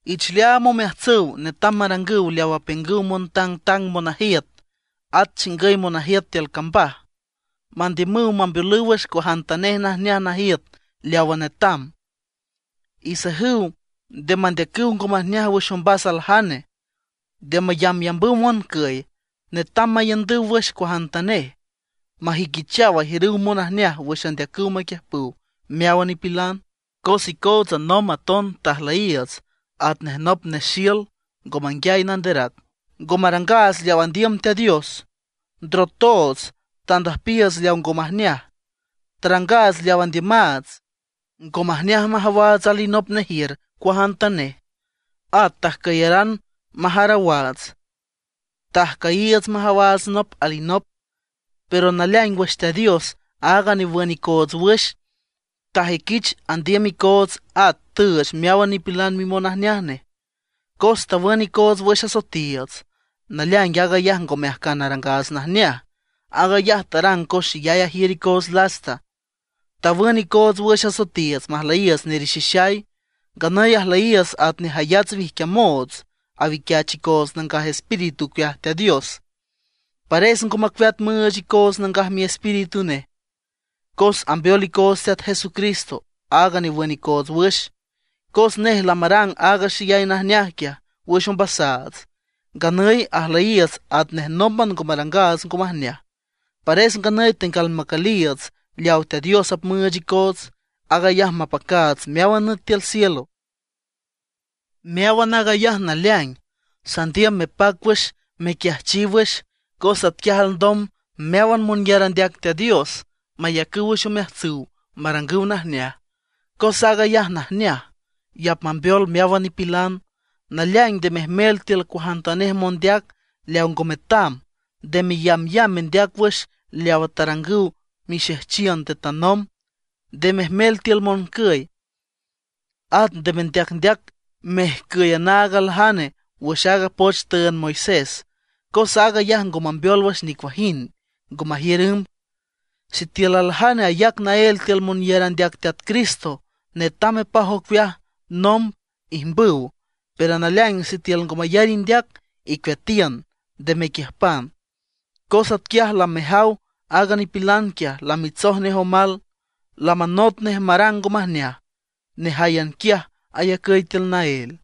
Iich leaam omeajtsüw netam marangüw leaw apiüngüw montangtang monajiüt, at chingüy monajiüt tiül cambaj, mandiümüw mambeolüw wüx cuajantanej najneaj najiüt leawa netam. Isajüw nde mandeacüw ngo majneaj wüx ombas aljane, nde mayambyambüw moncüy, netam maiündüw wüx cuajantanej, majüiquichaw ajiürüw monajneaj wüx andeacüw maquiüjpüw meáwan nipilan. Cos icootsa nomb aton tajlüyiiüts atnej nop nexiül ngo manguiay nanderac, ngo marangaats leaw andiüm Teat Dios. Ndrotoots tandüjpiiüts leaw ngo majneaj, tarangaats leaw andiümaats. Ngo majneaj majawaats alinop nejiür cuajantanej. At tajcüyaran majarawaats, tajcüyiiüts majawaats nop alinop. Pero naleaing wüx Teat Dios, aaga newün icoots wüx, tajüiquich andiüm icoots at tüüch meáwan nipilan mimonajneaj nej, cos tawün icoots wüx asoetiiüts. Naleaing aag ayaj ngome ajcan arangaats najneaj, aag ayaj tarang cos xeyay ajiür icoots lasta, tawün icoots wüx asoetiiüts, majlüyiiüts nerixixay. Nganüy ajlüyiiüts atnej jayats wijquiamoots, awiquiach icoots Nangaj Espíritu ocueaj Teat Dios. Pares ngo macueat müüch icoots Nangaj Miespíritu nej, cos ambeol icoots Teat Jesucristo, aaga newün icoots wüx. Cos nej lamarang aaga xeyay najneaj quiaj wüx ombasaats, nganüy ajlüyiiüts atnej nómban ngo marangaats ngo majneaj. Pares nganüy tenguial macüliiüts leaw Teat Dios apmüüch icoots, aag ayaj mapacaats meáwan nüt tiül cielo. Meáwan aag ayaj naleaing, sandiüm mepac wüx mequiajchiw wüx, cos atquiaj alndom meáwan monyar andeac Teat Dios mayacüw wüx omeajtsüw marangüw najneaj. Cos aag ayaj najneaj, y apmambeol meáwan nipilan. Naleaing nde mejmel tiül cuajantanej mondeac leaw ngo metam. Nde meyambyamb mendeac wüx leawa tarangüw mixejchiün nde tanomb, nde mejmel tiül moncüy. At nde mendeacndeac mejcüy anaag aljane wüx aaga poch tüünd Moisés, cos aag ayaj ngo mambeol wüx nicuajind, ngo majiür ümb. Sitiül aljane ayac naél tiül monyar andeac Teat Cristo, netam mepaj ocueaj nomb ijmbüw. Pero naleaing sitiül ngo mayar indeac, icueatiün, nde mequiüjpan. Cos quiaj lamejaw aaga nipilan quiaj lamitsoj nej omal, lamanot nej marang ngo majneaj, nejáyan quiaj ayacüy tiül naél.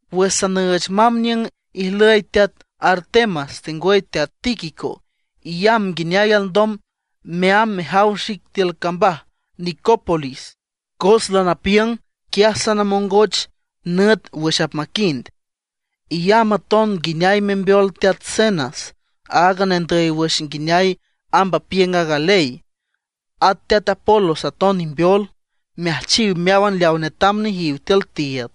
Wüx sanüüch mamb niüng ijlüy teat Artemas tengwüy teat Tíquico, iyamb nguineay alndom meamb mejaw xic tiül cambaj Nicópolis, cos lanapiüng quiaj sanamongoch nüt wüx apmaquind. Iyamb aton nguineay membeol teat Zenas, aaga nendüy wüx nguineay amb apiüng aaga ley. At teat Apolos aton imbeol, meajchiw meáwan leawa netam nejiw tiül tiiüd.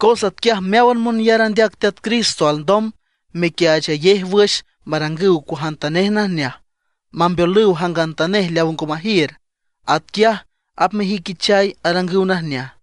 Cos atquiaj meáwan monyar andeac Teat Cristo alndom mequiaachayej wüx marangüw cuajantanej najneaj, mambeolüw jangantanej leaw ngo majiür. Atquiaj apmajüiquichaw arangüw najneaj.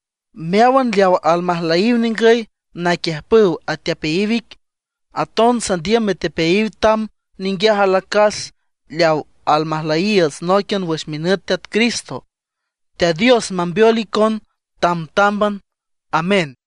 Meáwan leawa almajlüyiw ningüy naquiüjpüw atepeayiw ic. Aton sandiüm metepeayiw tam ninguiaj alacas leaw almajlüyiiüts nóiquian wüx minüt Teat Cristo. Teat Dios mambeol icon tamtámban. Amén.